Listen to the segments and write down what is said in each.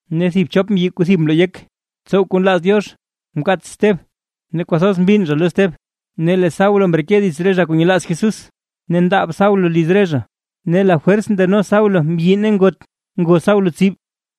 Ne thib chop mbyi kuu thib mloo yek tsow kuu nlaaz Diox mkaats Steb, ne kwathoz mbinn zha lo Steb. Ne lee Saulo mreke dits re zha kuu nyelaaz Jesús, ne ndaab Saulo liz re zha, ne lafwers ndeno Saulo mbyi ne ngot ngo Saulo tsib.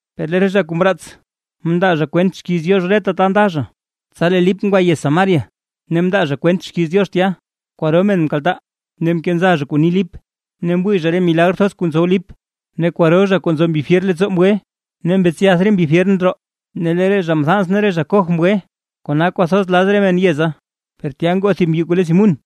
Per lee re zha kuu mraats mndaa zha kwent xkiiz Diox reta ta nda zha. Tsa lee Lip ngwa yez Samaria ne mndaa zha kwent xkiiz Diox tya. Kwaro men nkaltaa, ne nkenza zha kuu ni Lip, ne mwii zha re milagr thoz kuu ntsow Lip. Ne kwaro zha kuu nzo mbi fyer leettsoo ngwe, ne mbetsyath re mbi fyer ndroo, ne lee re zha mthans ne re zha koj mgwe, kona kwathoz laz re men yeza. Per tya ngoo thib mbyi kuu le Simún,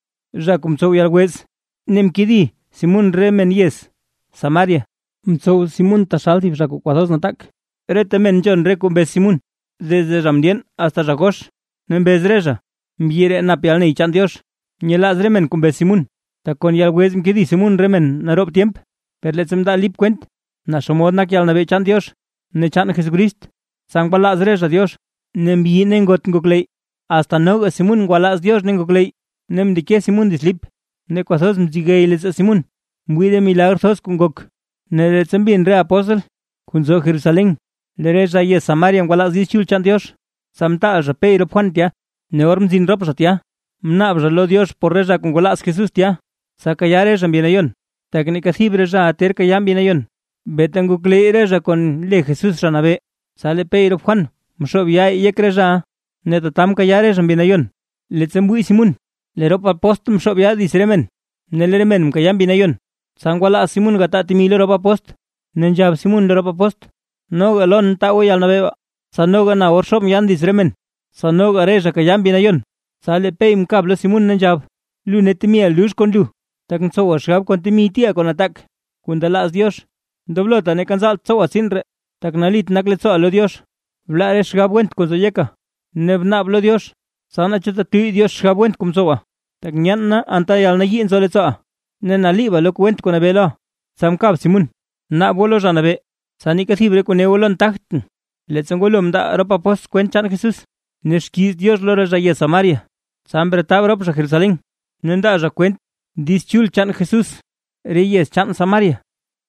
zha kuu mtsow yalwez ne mkedi Simún re men yez Samaria, mtsow Simún taxal thib zha kuu kwathoz nataak. Reta men nzhon re kuu mbez Simún, desde zha mndyeen asta zha gox ne mbez re zha: ―Mbyi ree nap yalney chaan Diox. Nyelaaz re men kuu mbez Simún, tak kon yalwez mkedi Simún re men naroob tyemp. Per leettsa mndaa Lip kwent naa xomod nak yalnabee chaan Diox ne chaan Jesucrist; tsa ngwalaaz re zha Diox, ne mbyi ne ngot ngokleyy. Asta noga Simún ngwalaaz Diox ne ngokleyy ne mndeke Simún dits Lip, ne kwathoz mzegey leettsoo Simún mwii re milagr thoz kuu ngok. Ne leettsa mbin re apóstl kuu nzo Jerusalén lee re zha yez Samaria ngwalaaz Diiz Chul chaan Diox, tsa mtaal zha Pey rop Juan tya. Ne or mzin rop zha tya, mnaab zha lo Diox por re zha kuu ngwalaaz Jesús tya; tsa kayaa re zha Mbi Nayon. Tak neeka thib re zhaʼa ter kayaa Mbi Nayon, beeta ngokleyy re zha kon le Jesús Zha Nabee. Tsa lee Pey rop Juan mxoob yaa yek re zhaʼa, ne tata mkayaa re zha Mbi Nayon. Leettsa mwii Simún lee rop apóstl nxoob yaa dits re men, ne lee re men nkayaa Mbi Nayon, tsa ngwalaaz Simún gataa temi lo rop apóstl, ne nzhab Simún lo rop apóstl: ―Noga lon taa goo yalnabee baa, tsa noga na or xoobʼn yaan dits re men, tsa noga re zha kayaa Mbi Nayon. Tsa lee Pey mkab lo Simún, ne nzhab: ―¡Lu ne temiʼa lux kon lu, tak ntsowa xgab kon temi tiiʼa kuu nataak kuu ndelaaz Diox! Ndoblota ne neeka nzaalt tsowa tsiin ree, tak nalit nak leettsooʼa lo Diox. Blaa re xgab went kuu nzo yeka, ne bnaab lo Diox tsa naa chu tetuyy Diox xgab went kuu mtsowa. Tak nyeen na anta yalnayii nzo leettsooʼa, ne naliiba lo kuu went kuu nabee loʼa. Tsa mkab Simún ne nzhab Simún: ―Naab goo lo Zha Nabee, tsa neeka thib re kuu ne goo lon tagtʼn. Leettsa ngwalo mndaa rop apóstl kwent chaan Jesús ne xkiiz Diox lo re zha yez Samaria, tsa mretab rop zha Jerusalén ne ndaa zha kwent Diiz Chul chaan Jesús re yez chaan Samaria.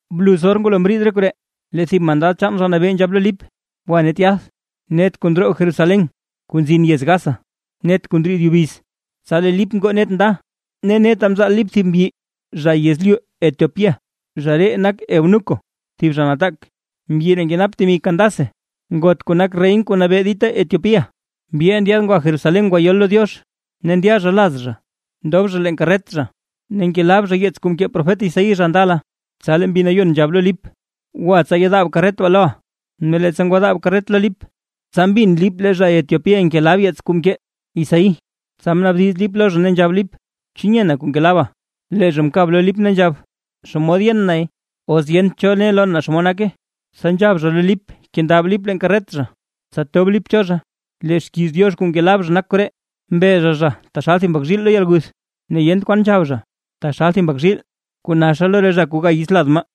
Bluz or ngwalo mriid re koree, lee thib mandad chaan Zha Nabee, nzhab lo Lip: ―Gwa net yath, net kuu ndroo Jerusalén kuu nzin yez Gaza. Net kuu ndriid yubiz. Tsa lee Lip ngoo net nda, ne neta mzaal Lip thib mbyi zha yezlyu Etiopía, zha ree nak Eunuco, thib zha nataak; mbyi ree nkenap temi Candace ngot kuu nak reyna kuu nabee dita Etiopía, mbyiʼa ndyaad ngwa Jerusalén ngwayol lo Diox. Ne ndya zha laz zha, ndob zha leen karret zha ne ngelab zha yeets kuu mkee profet Isaí zha ndala. Tsa lee Mbi Nayon nzhab lo Lip: ―Gwa tsa yedaab karret baa loʼa. Ne leettsa ngwadaab karret lo Lip, tsa mbin Lip lee zha Etiopía ngelab yeets kuu mkee Isaí. Tsa mnaabdiz Lip lo zha, ne nzhab Lip: ―¿Chu nyena kuu ngelaba? Lee zha mkab lo Lip nzhab: ―¿Xomod yen nay, os yent cho ne lon naa xomod nake? Tsa nzhab zha lo Lip kendab Lip leen karret zha, tsa tob Lip cho zha. Lee xkiiz Diox kuu ngelab zha nak koree: Mbe zha zha taxal thib mbak zhiil lo yalguth; ne yent kwan nzhab zha taxal thib mbak zhiil kuu naxa lo re zha kuu ga yits lad maa.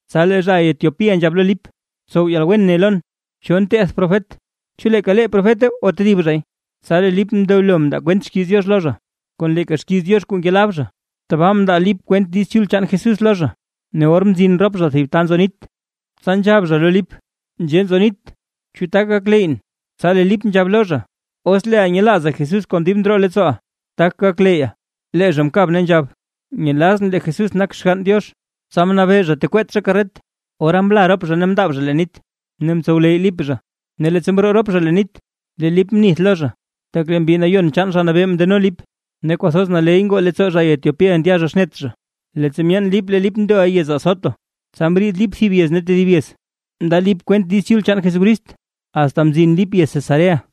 Tsa lee zha Etiopía nzhab lo Lip: ―Tsow yalwen ne lon, ¿cho nteth profet? ¿Chu leeka lee profeta o tedib zhay? Tsa lee Lip mndelo mndaa kwent xkiiz Diox lo zha, kon leeka xkiiz Diox kuu ngelab zha, tabaa mndaa Lip kwent Diiz Chul chaan Jesús lo zha. Ne or mzin rop zha thib ta nzo nit, tsa nzhab zha lo Lip: ―Nzhee nzo nit, ¿chu tak gakleyyʼn? Tsa lee Lip nzhab lo zha: ―Os leeʼa nyelaaza Jesús kon dib ndroo leettsooʼa, tak gakleyya. Lee zha mkab ne nzhab: ―Nyelazʼn lee Jesús nak Xgann Diox. Tsa mnabee zha tekweet zha karret, ora mla rop zha ne mndaab zha leen nit, ne mtsowleyy Lip zha. Ne leettsa mroo rop zha leen nit, lee Lip mnith lo zha, tak lee Mbi Nayon chaan Zha Nabee mndeno Lip; ne kwathoz naley ngoo leettsoo zha Etiopía ndya zha xnet zha. Leettsa myeen Lip lee Lip ndoʼa yez Azoto, tsa mriid Lip thib yez ne tedib yez, mndaa Lip kwent Diiz Chul chaan Jesucrist, asta mzin Lip yez Cesarea.